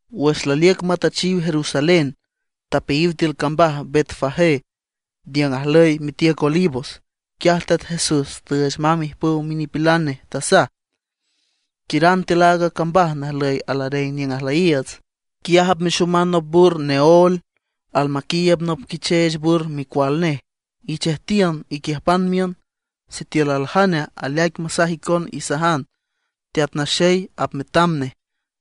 Wüx laliüc matüchiw Jerusalén, tapeayiw tiül cambaj Betfagé niüng ajlüy mitiüc Olivos. Quiaj Teat Jesús tüüch mamb ijpüw minipilan nej. Tasaj: ―Quiüran tiül aaga cambaj najlüy alareng niüng ajlüyiiüts. Quiaj apmexoman nop bur neóel, almaquiiüb nop quicheech bur micual nej. Ichejtiün, iquiüjpan miün. Sitiül aljane aleaic masaj icon, isajan: “Teat Naxey apmetam nej,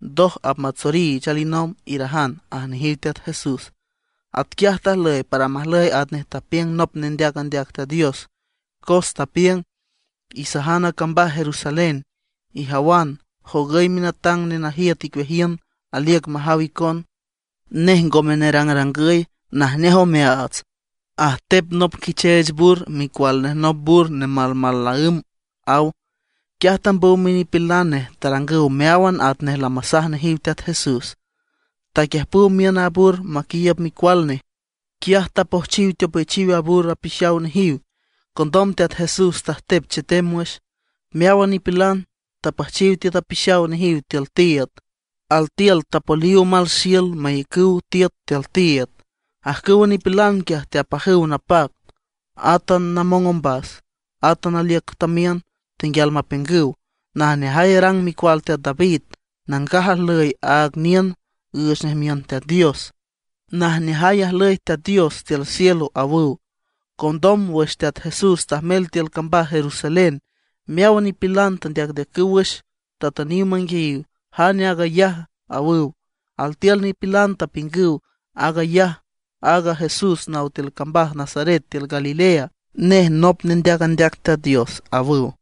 ndoj apmatsoriich alinomb”, irajan ―aj nejiw Teat Jesús. Atquiaj tajlüy para majlüy atnej tapiüng nop nendeac andeac Teat Dios, cos tapiüng: Isajan a cambaj Jerusalén: “Ijawan, jogüy minatang nenajiüt icueajiün, aliüc majaw icon, Nej ngome nerangrangüy, najneaj omeaats; ajtep nop quicheech bur, micual nej nop bur nemalmal naǘm”, aw. Quiaj tambüw minipilan nej. Tarangüw meáwan atnej lamasaj nejiw Teat Jesús. Taquiüjpüw miün a bur maquiiüb micual nej. Quiaj tapojchiw teopechiw a bur apixaw nejiw. Condom Teat Jesús tajtep chetem wüx. Meáwan nipilan, tapüjchiw tiüt apixaw nejiw tiül tiiüd, altiül tapoliw omal xiül mayacüw tiüt tiül tiiüd. Ajcüwa nipilan quiaj teapajüw napac, átan namong ombas, átan aliüc tamiün, tenguial mapiüngüw: ―¡Najneajay arang micual teat David! ¡Nangaj ajlüy aaga niün, üüch nej miün Teat Dios! ¡Najneajay ajlüy Teat Dios tiül cielo! ―awüw. Condom wüx Teat Jesús tajmel tiül cambaj Jerusalén meáwan nipilan tendeacndeacüw wüx, tatüniw manguiayiw: ―¿Jane aag ayaja? ―awüw. Altiül nipilan tapiüngüw: ―Aag ayaj aaga Jesús naw tiül cambaj Nazaret tiül Galilea. Nej nop nendeac andeac Teat Dios ―awüw.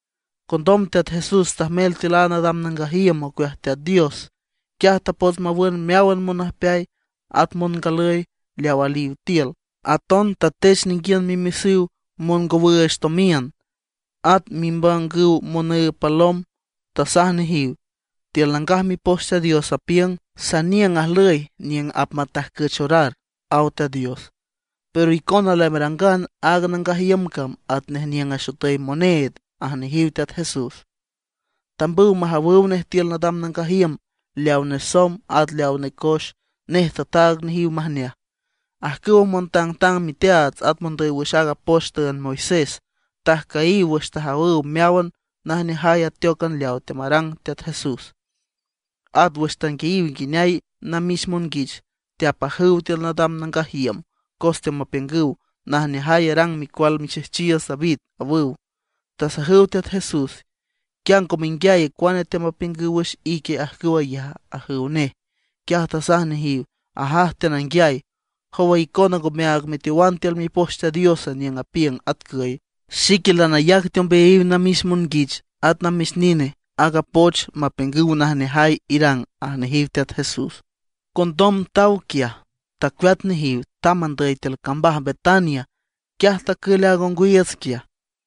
Condom Teat Jesús tajmel tiül aaga nadam nangaj iüm ocueaj Teat Dios. Quiaj tapots mawün meáwan monüjpeay at mongalüy leaw aliw tiül. Aton tatech ninguiün mimesüw mongowüüch tomiün, at mibangüw monüüb palom. Tasaj nejiw: ―Tiül Nangaj Mipoch Teat Dios apiüng: “Saniüng ajlüy niüng apmatajcüch orar”, aw Teat Dios. Pero icona lamerangan aaga nangaj iüm cam atnej niüng axotüy moneed ―aj nejiw Teat Jesús. Tambüw majawüw nej tiül nadam nangaj iüm leaw nesomb at leaw necoex, nej tataag nejiw majneaj. Ajcüwa montangtang miteaats at mondüy wüx aaga poch tüünd Moisés tajcüyiw wüx tajawüw meáwan najneajay ateócan leaw teamarang Teat Jesús; at wüx tanguiayiw nguineay a namix monguich teapajüw tiül nadam nangaj iüm, cos teamapiüngüw: “¡Najneajay arang micual mixejchiiüts David!” awüw. Tasajüw Teat Jesús: ―¿Quia ngo menguiay cuane teamapiüngüw wüx ique ajcüw ayaja? ―ajüw nej. Quiaj tasaj nejiw: ―Ajaj, teananguiay. ¿Jowa icona ngomeaag meteowan tiül Mipoch Teat Dios? niüng apiüng atcüy: Xique lanayac teombeayiw namix monguich at namix nine aaga poch mapiüngüw najneajay irang ―aj nejiw Teat Jesús. Condom taw quiaj tacueat nejiw, tamb andüy tiül cambaj Betania. Quiaj tacül aaga ongwiiüts quiaj.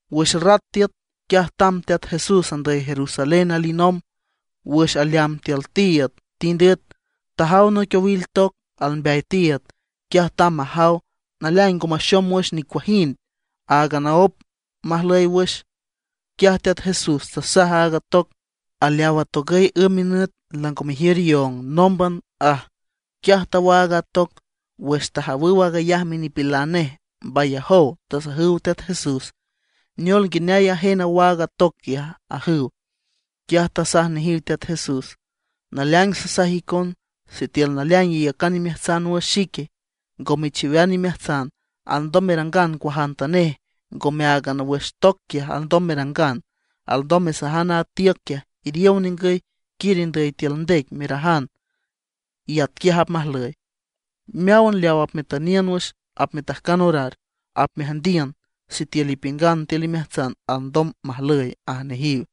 Wüx rat tiüt, quiaj tamb Teat Jesús andüy Jerusalén alinomb. Wüx aleamb tiül tiiüd tind üet. Tajaw noic owil toc almbeay tiiüd. Quiaj tamb majaw, naleaing ngo maxom wüx nicuajind, áagan aóp majlüy wüx. Quiaj Teat Jesús tasaj aaga toc: ―¡Aleaw atogüy ümb minüt, lango mejiür ióng nómban! ―aj. Quiaj tawaag a toc. Wüx tajawüw aag ayaj minipilan nej mbayajow. Tasajüw Teat Jesús: ―¿Neol nguineay ajen awaag a toc quiaja? ―ajüw. Quiaj tasaj nejiw Teat Jesús: ―Naleaing sasaj icon, sitiül naleaing iyacan imeajtsan wüx xique, ngo mechiwean imeajtsan, alndom merangan cuajantanej. Ngome áagan wüx toc quiaj alndom merangan, alndom mesajan aaga tiüc quiaj: “Iriow ningüy, quiür indüy tiül ndec”, merajan, y atquiaj apmajlüy. Meáwan leaw apmetüniün wüx apmetajcan orar, apmeajndiün sitiül ipiüngan tiül imeajtsan alndom majlüy ―aj nejiw.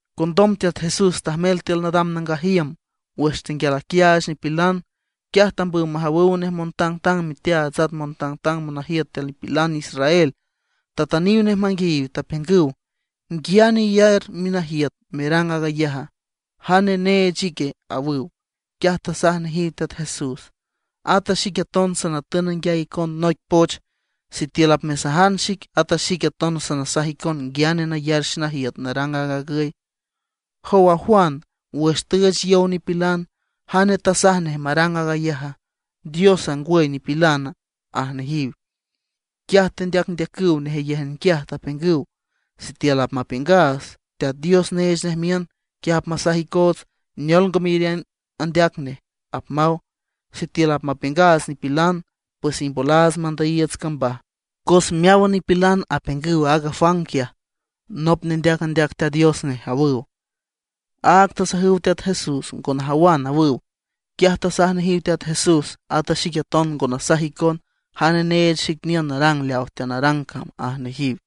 Condom Teat Jesús tajmel tiül nadam nangaj iüm. Wüx tenguial aquiaach nipilan, quiaj tambüw majawüw nej montangtang miteaats at montangtang monajiüt tiül nipilan israel. Tatüniw nej manguiayiw, tapiüngüw: ―¿Nguiane iyar minajiüt merang aag ayaja? ¿Jane neech ique? ―awüw. Quiaj tasaj nejiw Teat Jesús: ―At a xique aton sanatün nanguiay icon noic poch. Sitiül apmesajan xic, at a xique aton sanasaj icon nguiane nayar xenajiüt narang aag agüy. Jow a Juan, wüx tüüch yow nipilan, ¿jane tasaj nej marang aag ayaja? ¿Diosa, ngwüy nipilana? ―aj nejiw. Quiaj tendeacndeacüw nejeyéjan quiaj, tapiüngüw: ―Sitiül apmapiüngaats Teat Dios neech nej miün, quiaj apmasaj icoots: “¿Neol ngo meyariün andeac neje?” apmaw. Sitiül apmapiüngaats nipilan, pues imbolaats mandüyiiüts cambaj, cos meáwan nipilan apiüngüw aaga Juan quiaj nop nendeac andeac Teat Dios nej ―awüw. Áag tasajüw Teat Jesús: ―Ngo najawan ―awüw. Quiaj tasaj nejiw Teat Jesús: ―At a xique aton ngo nasaj icon jane neech xic niün narang leaw teanarang cam ―aj nejiw.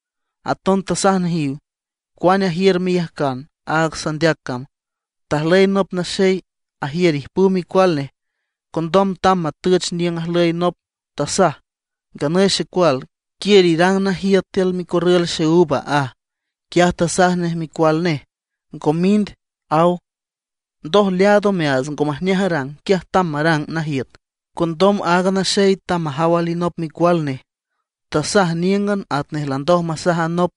Aton tasaj nejiw: ―¿Cuane ajiür meyajcan aaga sanandeac cama? Tajlüy nop naxey ajiür ijpüw micual nej. Condom tamb matüch niüng ajlüy nop, tasaj: “Nganüy xecual, quiür irang najiüt tiül micorrül xeúva”, aj. Quiaj tasaj nej micual nej: “Ngo mind”, aw. Ndoj leaad omeaats ngo majneaj arang, quiaj tamb marang najiüt. Condom aaga naxey tamb majaw alinop micual nej. Tasaj níüngan atnej landoj masaj a nop.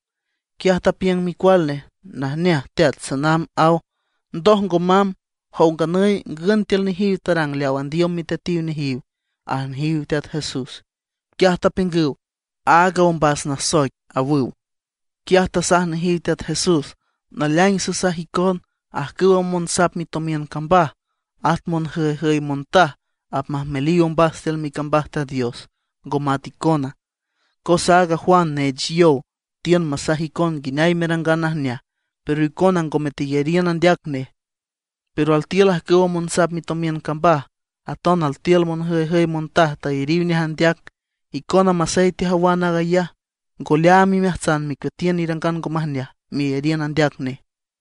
Quiaj tapiüng micual nej: “Najneaj teat, sanamb”, aw. Ndoj ngo mamb. ¿Jow nganüy, ngün tiül nejiw tarang leaw andiüm miteatiw nejiw? ―aj nejiw Teat Jesús. Quiaj tapiüngüw: ―Aaga nasoic ombas ―awüw. Quiaj tasaj nejiw Teat Jesús: ―Naleaing sasaj icon, ajcüwa monsap mitomiün cambaj at monjüyjüy montaj apmajmeliw ombas tiül micambaj Teat Dios, ngo mat icona. Cos aaga Juan neech yow tiün masaj icon nguineay merangan najneaj, pero icona ngome teyariün andeac nej. Pero altiül ajcüwa monsap mitomiün cambaj, aton altiül monjüyjüy montaj tayariw nej andeac. Icona masey tejawan aag ayaj, ngo leaam imeajtsan mecueatiün irangan ngo majneaj, meyariün andeac nej.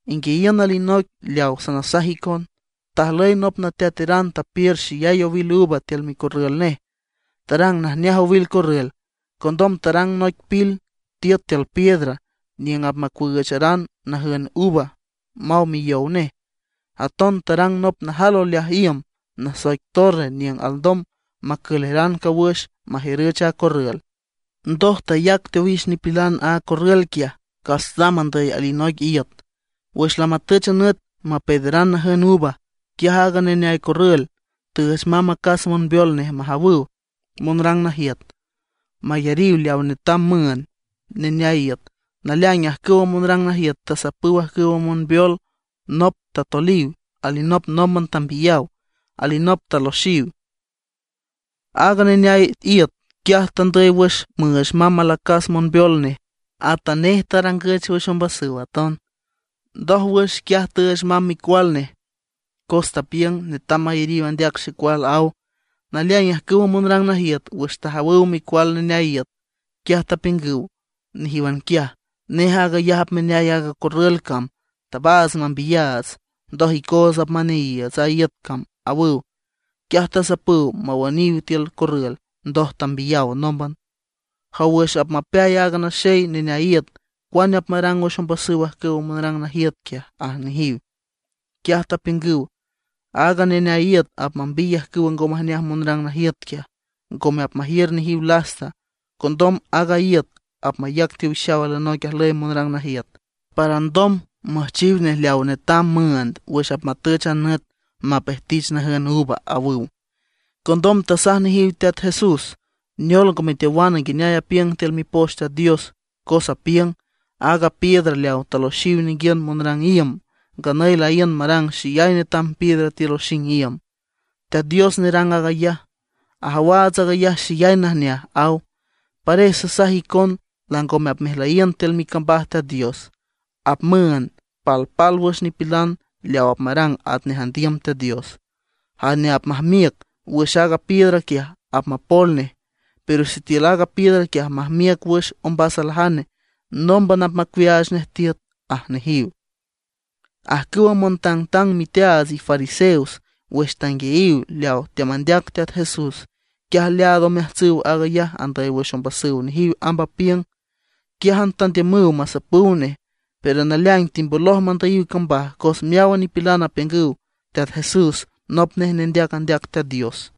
’Inguiayiün alinoic leaw sanasaj icon: Tajlüy nop nateateran tapiür xeyay owil uva tiül micorrül nej, tarang najneaj owil corrül. Condom tarang noic pil tiüt tiül piedra niüng apmacuüücharan najün uva maw miyow nej. Aton tarang nop najal oleaj iüm nasoic torre niüng alndom macüleran cawüx majiürüch a corrül. ’Ndoj tayac teowix nipilan aaga corrül quiaj, cas tamb andüy alinoic iüt. Wüx lamatüch a nüt mapeederan najün uva, quiaj aaga neneay corrül tüüch mamb acas monbeol nej majawüw monrang najiüt, mayariw leaw netam müünd neneay iüt. Naleaing ajcüwa monrang najiüt tasapüw ajcüwa monbeol. Nop tatoliw, alinop nómban tambiyaw, alinop taloxiw. Aaga neneay iüt quiaj tandüy wüx müüch mamb alacas monbeol nej. Atanej tarangüch wüx ombasüw aton. ’Ndójwüx quiaj tüüch mamb micual nej, cos tapiüng: “Netam mayariw andeac xecual”, aw. Naleaing ajcüwa monrang najiüt, wüx tajawüw micual neneay iüt, quiaj tapiüngüw nejíwan quiaj: “Nej aag ayaj apmeneay aaga corrül cam. Tabaats mambiyaats, ndoj icoots apmaneayiiüts a iüt cam”, awüw. Quiaj tasapüw mawüniw tiül corrül, ndoj tambiyaw nómban. ’Jow, wüx apmapeay aaga naxey neneay iüt, ¿cuane apmarang wüx ombasüw ajcüwa monrang najiüt quiaja? ―aj nejiw. Quiaj tapiüngüw: ―Aaga neneay iüt apmambiy ajcüwa ngo majneaj monrang najiüt quiaj, ngome apmajiür nejiw lasta. Condom aaga iüt apmayac teowix alinoic ajlüy monrang najiüt para alndom müjchiw nej leaw netam müünd wüx apmatüch a nüt mapejtich najün uva ―awüw. Condom tasaj nejiw Teat Jesús: ―¿Neol, ngo meteowan nguineay apiüng tiül Mipoch Teat Dios? cos apiüng: Aaga piedra leaw taloxiw ninguiün monrang iüm, nganüy laíün marang xeyay netam piedra tiül oxing iüm. Teat Dios nerang aag ayaj, ajawaats aag ayaj xeyay najneaj, aw. ’Pares sasaj icon langome apmejlüyiün tiül micambaj Teat Dios. Apmüünd palpálwüx nipilan leaw apmarang atnej andiüm Teat Dios. Jane apmajmiüc wüx aaga piedra quiaj apmapol nej. Pero sitiül aaga piedra quiaj apmajmiüc wüx ombas aljane, nómban apmacuiaach nej tiüt ―aj nejiw. Ajcüwa montangtang miteaats y fariseos, wüx tanguiayiw leaw teamandeac Teat Jesús, quiaj leaad omeajtsüw aag ayaj andüy wüx ombasüw nejiw amb apiüng. Quiájan tandiümüw masapüw nej; pero naleaing timboloj mandüyiw cambaj, cos meáwan nipilan apiüngüw Teat Jesús nop nej nendeac andeac Teat Dios.